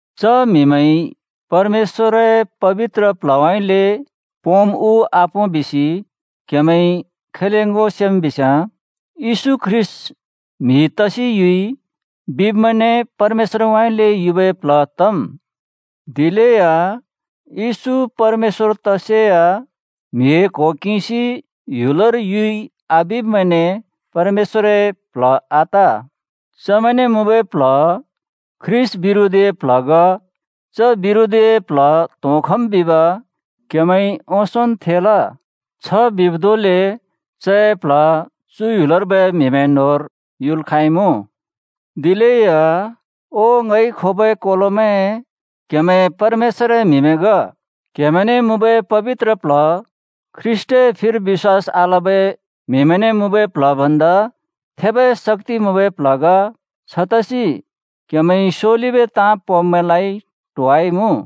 च म्हिमैंइ परमेश्‍वरए पबित्र प्ल्हउँइँले पोंम् उ आपों बिसि क्‍हेमैंइ खैले ङो सेम् बिस्‍याँ, “येशू ख्रीष्‍ट म्‍हि तसि युइ,” बिब्मैंने परमेश्‍वरउँइँले युबै प्ल्ह तम्। दिलेया येशू परमेश्‍वर तसेया म्हिए क्हो किंसि ह्‍युलर युइ आबिब्मैंने परमेश्‍वरए प्ल्ह आत। चमैंने मुँबै प्ल्ह ख्रीष्‍ट बिरोधीए प्ल्ह ग। च बिरोधीए प्ल्ह त्‍होंखम् बिब क्हेमैंइ ओंसोंन् थेल। छ बिब् धोंले चए प्ल्ह चु ह्‍युलर्बै म्‍हिमैं न्‍होंर युल् खाँइमुँ। दिलेया ओ ङइ खोबै कोलोमैं, क्‍हेमैं परमेश्‍वरए म्हिमैं ग। क्‍हेमैंने मुँबै पबित्र प्ल्ह ख्रीष्‍टए फिर बिश्‍वास आलबै म्हिमैंने मुँबै प्ल्ह भन्दा थेबै शक्‍ति मुँबै प्ल्ह ग। छतसि क्‍हेमैंइ स्‍योलिबै ताँ पोंब्‍मैंलाइ ट्होवाइमुँ।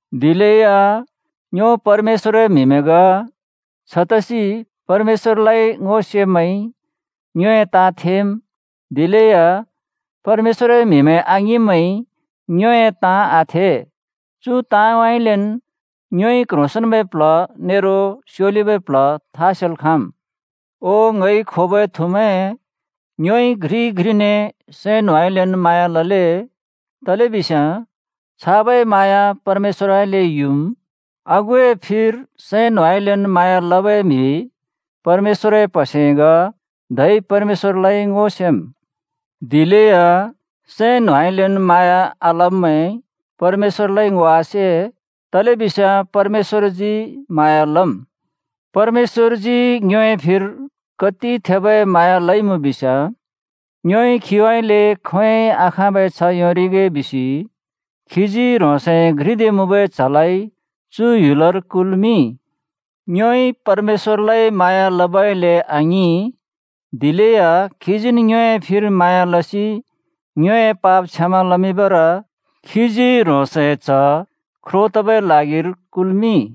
दिलेया ङ्यो परमेश्‍वरए म्हिमैं ग। छतसि परमेश्‍वरलाइ ङो सेब्‍मैंइ ङ्योए ताँ थेम्, दिलेया परमेश्‍वरए म्हिमैं आङिंब्मैंइ ङ्योए ताँ आथे। चु ताँउँइँलेन् ङ्योइ क्ह्रोंसेंन्बै प्ल्ह नेरो स्योलिबै प्ल्ह था सेल् खाँम्। ओ ङइ खोबै थुमैं, ङ्योइ घ्रिइ घ्रिने सैं न्होंउँइँलेन् म्हाँया लले, तलेबिस्याँ छाबै म्हाँया परमेश्‍वरउँइँले युम्। आगुए फिर सैं न्होंउँइँलेन् म्हाँया लबै म्हि परमेश्‍वरए प्हसे ग, धै परमेश्‍वरलाइ ङो सेम्। दिलेया सैं न्होंउँइँलेन् म्हाँया आलब्‍मैंइ परमेश्‍वरलाइ ङो आसे, तलेबिस्याँ परमेश्‍वरजी म्हाँया लम्। परमेश्‍वरजी ङ्योए फिर कति थेबै म्हाँया लइमुँ बिस्‍याँ, ङ्योइ खीउँइँले खोंयोंइ आखाँबै छ्ह योंरिगे बिसि खीजी ह्रोंसए घ्रिदे मुँबै च्‍हलाइ चु ह्‍युलर कुल्‍मिंइ। ङ्योइ परमेश्‍वरलाइ म्हाँया लबइले आङिं, दिलेया खीजीन् ङ्योए फिर म्हाँया लसि ङ्योए पाप क्षमा लमिंबर खीजी ह्रोंसए च्‍ह ख्रो तबै ल्हागिर कुल्‍मिंइ।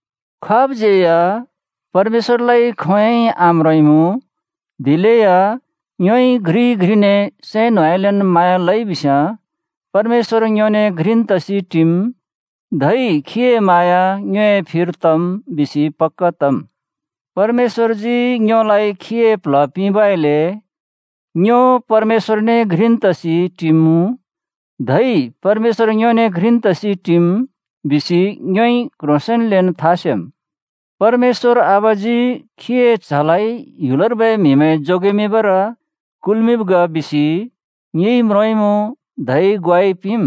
खाबज्‍यै या परमेश्‍वरलाइ खोंयोंइ आम्रोंइमुँ, दिलेया ङ्योइ घ्रिइ घ्रिने सैं न्होंउँइँलेन् म्हाँया लइ बिस्‍याँ परमेश्‍वर ङ्योने घ्रिन् तसि टिम्, धै खीए म्हाँया ङ्योए फिर तम् बिसि पक्‍का तम्। परमेश्‍वरजी ङ्योलाइ खीए प्ल्ह पिंबइले “ङ्यो परमेश्‍वरने घ्रिन् तसि टिमुँ, धै परमेश्‍वर ङ्योने घ्रिन् तसि टिम्” बिसि ङ्योइ क्ह्रोंसेंन्लेन् था सेम्। परमेश्‍वर आबाजी खीए च्‍हलाइ ह्‍युलर्बै म्‍हिमैं जोगेबर कुल्‍मिंब् ग बिसि ङिइ म्रोंइमुँ धै ग्वाइ पिंम्।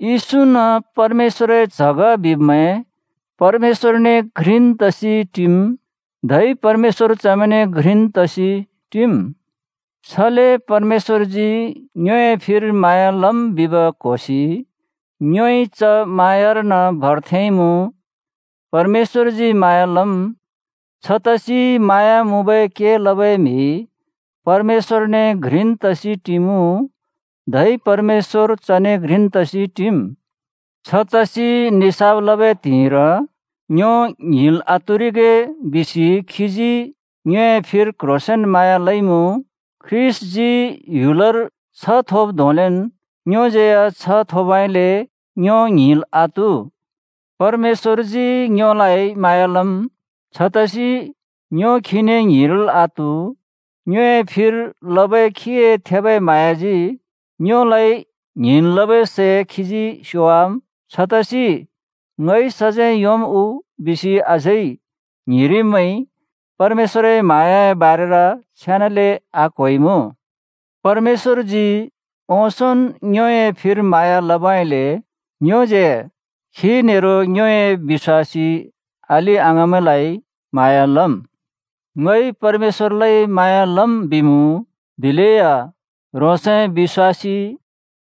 येशून् परमेश्‍वरए च्‍ह ग बिब्मैं परमेश्‍वरने घ्रिन् तसि टिम्, धै परमेश्‍वर चमैंने घ्रिन् तसि टिम्। छले परमेश्‍वरजी ङ्योए फिर म्हाँया लम् बिब् क्होसि ङ्योइ च म्हाँयारन भर थेंइमुँ। परमेश्‍वरजी म्हाँया लम्। छतसि म्हाँया मुँबै के लबै म्हि परमेश्‍वरने घ्रिन् तसि टिमुँ, धै परमेश्‍वर चने घ्रिन् तसि टिम्। छतसि निसाफ लबै त्हिंइर ङ्यो ङ्हिंल् आत्हुरिगे बिसि खीजी ङ्योए फिर क्ह्रोंसेंन म्हाँया लइमुँ। ख्रीष्‍टजी ह्‍युलर छ्ह थोब् धोंलेन् ङ्योज्‍यै या छ्ह थोबइले ङ्यो ङ्हिंल् आत्हु। परमेश्‍वरजी ङ्योलाइ म्हाँया लम्। छतसि ङ्यो खीने ङ्हिंरिल् आत्‍हु। ङ्योए फिर लबै खीए थेबै म्हाँयाजी ङ्योलाइ ङ्हिंन् लबै सै खीजी स्‍योवाम्। छतसि “ङइ सजैं योंम् उ?” बिसि अझै ङ्हिंरिब्मैंइ परमेश्‍वरए म्हाँयाए बारेर छेनाले आक्‍होइमुँ। परमेश्‍वरजी ओंसोंन् ङ्योए फिर म्हाँया लबइले ङ्योज्यै (खी नेरो ङ्योए बिश्‍वासी अलि-अङाँमैंलाइ) म्हाँया लम्। “ङइ परमेश्‍वरलाइ म्हाँया लम्,” बिमुँ, दिलेया ह्रोंसए बिश्‍वासी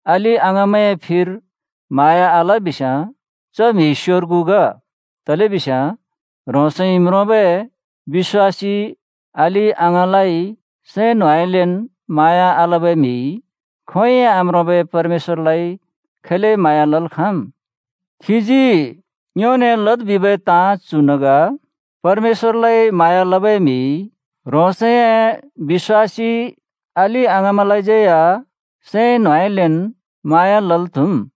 अलि-अङाँमैंए फिर म्हाँया आल बिस्याँ च म्हि स्‍योर्गु ग। तलेबिस्याँ ह्रोंसइ म्रोंबै बिश्‍वासी अलि-अङाँलाइ सैं न्होंउँइँलेन् म्हाँया आलबै म्हिइ खोंयोंइ आम्रोंबै परमेश्‍वरलाइ खैले म्हाँया लल् खाँम्? खीजी ङ्योने लद् बिबै ताँ चुन् ग: परमेश्‍वरलाइ म्हाँया लबै म्हिइ ह्रोंसए बिश्‍वासी अलि-अङाँमैंलाज्यै या सैं न्होंउँइँलेन् म्हाँया लल् त्‍हुम्।